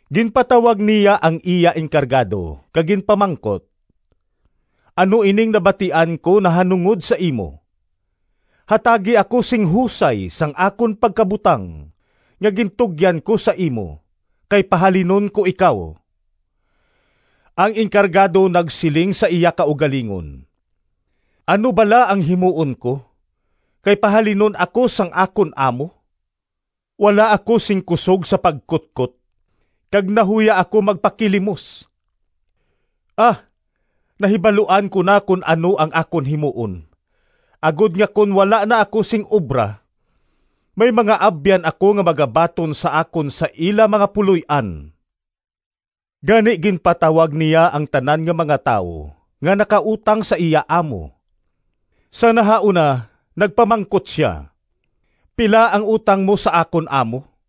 Ginpatawag niya ang iya enkargado kag ginpamangkot, ‘Ano ining nabatian ko nahanungod sa imo? Hatagi ako sing husay sang akon pagkabutang nga gintugyan ko sa imo, kay pahalinon ko ikaw.’ Ang enkargado nagsiling sa iya kaugalingon, ‘Ano bala ang himuon ko, kay pahalinon ako sang akon amo? Wala ako sing kusog sa pagkutkot, kag nahuya ako magpakilimos. A, nahibaluan ko na kon ano ang akon himuon, agod nga kon wala na ako sing obra may mga abyan ako nga magabaton sa akon sa ila mga puloy-an.’ Gani ginpatawag niya ang tanan nga mga tawo nga nakautang sa iya amo. Sa nahauna nagpamangkot sia, ‘Pila ang utang mo sa akon amo?’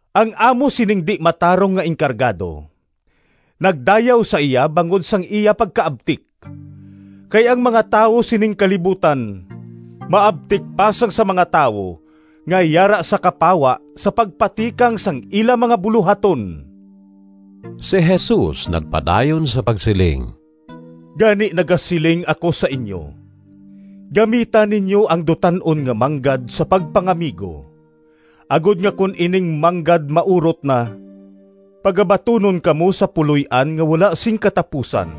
Ang amo sining di-matarong nga enkargado nagdayaw sa iya bangod sang iya pagkaabtik, kay ang mga tawo sining kalibutan maabtik pa sang sa mga tawo nga yara sa kapawa sa pagpatikang sang ila mga bulohaton.” Si Jesus nagpadayon sa pagsiling, “Gani nagasiling ako sa inyo, gamita ninyo ang dutan-on nga manggad sa pagpangamigo, agod nga kon ining manggad maurot na pagabatunon kamo sa puloy-an nga wala sing katapusan.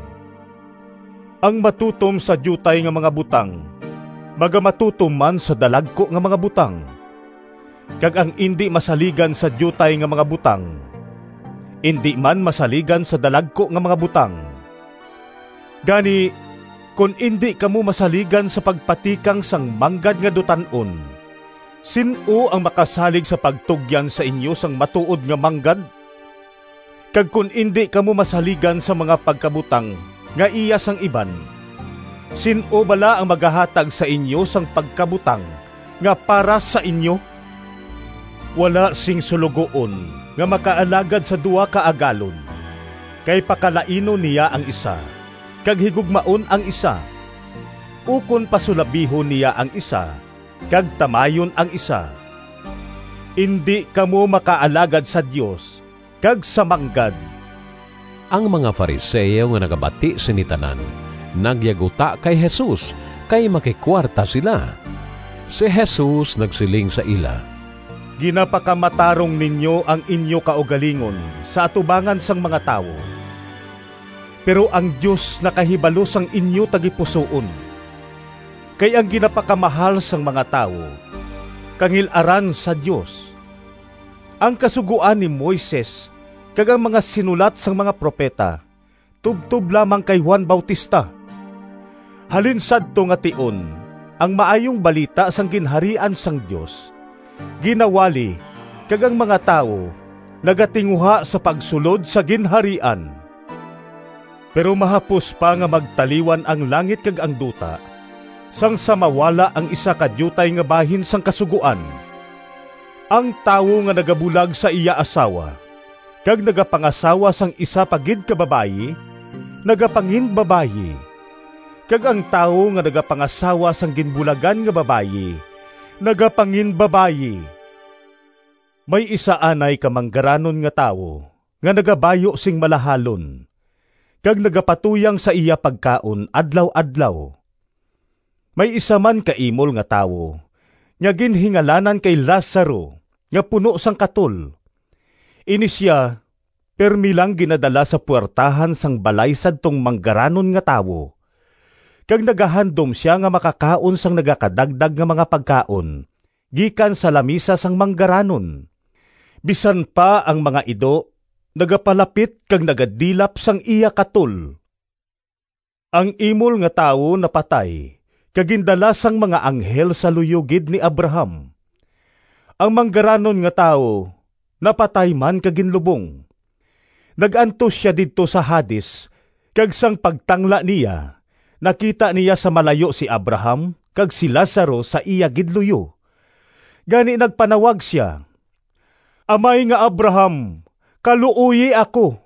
Ang matutom sa diutay nga mga butang magamatutom man sa dalagku nga mga butang, kag ang indi masaligan sa diutay nga mga butang indi man masaligan sa dalagku nga mga butang. Gani, kon indi kamo masaligan sa pagpatikang sang manggad nga dutan-on, sin-o ang makasalig sa pagtugyan sa inyo sang matuod nga manggad? Kag kon indi kamo masaligan sang mga pagkabutang nga iya sang iban, sin-o bala ang magahatag sa inyo sang pagkabutang nga para sa inyo? “Wala sing suloguon nga makaalagad sa duha ka agalon, kay pakalainon niya ang isa kag higugmaon ang isa, ukon pasulabihon niya ang isa kag tamayon ang isa. Indi kamo makaalagad sa Dios kag sa manggad!” Ang mga Fariseo nga nakabati sini tanan, nagyaguta kay Jesus kay makikuwarta sila. Si Jesus nagsiling sa ila, “Ginapakamatarong ninyo ang inyo kaugalingon sa atubangan sang mga tawo, pero ang Dios nakahibalo sang inyo tagipusoon. Kay ang ginapakamahal sang mga tawo kangil-aran sa Dios. “Ang Kasugoan ni Moises kag ang mga sinulat sang mga propeta tubtob lamang kay Juan Bautista. Halin sadto nga tion ang Maayong Balita sang Ginharian sang Dios ginawali kag ang mga tawo nagatinguha sa pagsulod sa Ginharian. Pero mahapos pa nga magtaliwan ang langit kag ang duta sang sa mawala ang isa ka diutay nga bahin sang kasugoan. “Ang tawo nga nagabulag sa iya asawa kag nagapangasawa sang isa pa gid ka babayi nagapanginbabayi, kag ang tawo nga nagapangasawa sang ginbulagan nga babayi nagapanginbabayi.” “May isa anay ka manggaranon nga tawo nga nagabayu sing malahalon kag nagapatuyang sa iya pagkaon adlaw-adlaw. May isa man ka imol nga tawo nga ginhingalanan kay Lazaro nga puno sang katol. Ini sia pirme lang ginadala sa puwertahan sang balay sadtong manggaranon nga tawo kag nagahandom sia nga makakaon sang nagakadagdag nga mga pagkaon gikan sa lamisa sang manggaranon. Bisan pa ang mga ido nagapalapit kag nagadilap sang iya katol. Ang imol nga tawo napatay kag gindala sang mga anghel sa luyo gid ni Abraham. Ang manggaranon nga tawo napatay man kag ginlubong. Nag-antos sia didto sa Hades kag sang pagtangla niya nakita niya sa malayo si Abraham kag si Lazaro sa iya gid luyo. Gani nagpanawag sia, ‘Amay nga Abraham! Kaluoyi ako,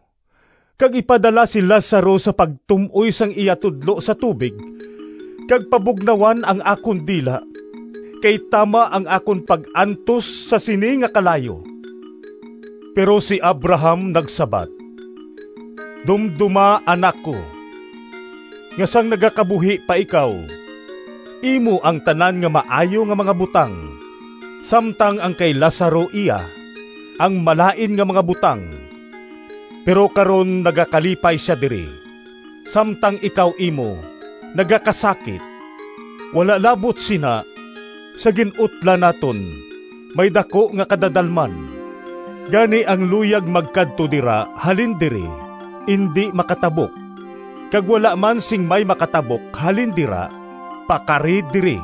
kag ipadala si Lazaro sa pagtum-oy sang iya tudlo sa tubig kag pabugnawan ang akon dila, kay tama ang akon pag-antos sa sini nga kalayo.’ Pero si Abraham nagsabat, ‘Dumdoma, anak ko, nga sang nagakabuhi pa ikaw, imo ang tanan nga maayo nga mga butang, samtang ang kay Lazaro iya ang malain nga mga butang. Pero karon nagakalipay sia diri, samtang ikaw imo nagakasakit. Wala labot sina, sa gin-utlan naton may daku nga kadadalman, gani ang luyag magkadto dira halin diri indi makatabok, kag wala man sing may makatabok halin dira pakari diri.’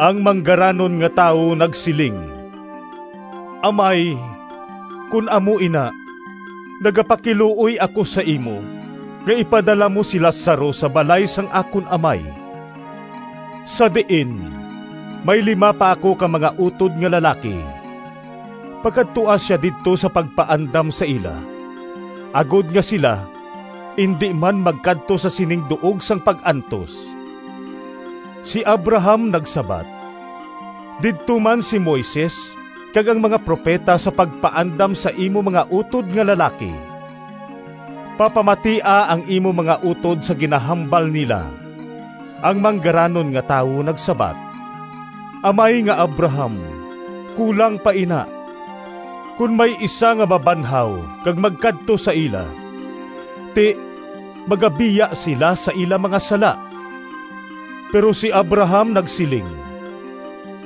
Ang manggaranon nga tawo nagsiling, ‘Amay, kon amo ina, nagapakiluoy ako sa imo nga ipadala mo si Lazaro sa balay sang akon amay, sa diin may lima pa ako ka mga utod nga lalaki. Pakadtoa sia didto sa pagpaandam sa ila agod nga sila indi man magkadto sa sining duog sang pag-antos.’ Si Abraham nagsabat, ‘Didto man si Moises kag ang mga propeta sa pagpaandam sa imo mga utod nga lalaki. Papamatia ang imo mga utod sa ginahambal nila.’ Ang manggaranon nga tawo nagsabat, ‘Amay nga Abraham, kulang pa ina. Kon may isa nga mabanhaw kag magkadto sa ila, ti, magabiya sila sa ila mga sala.’ Pero si Abraham nagsiling,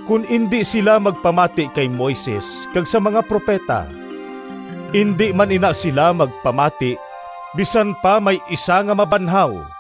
‘Kon indi sila magpamati kay Moises kag sa mga propeta, indi man ina sila magpamati bisan pa may isa nga mabanhaw.’”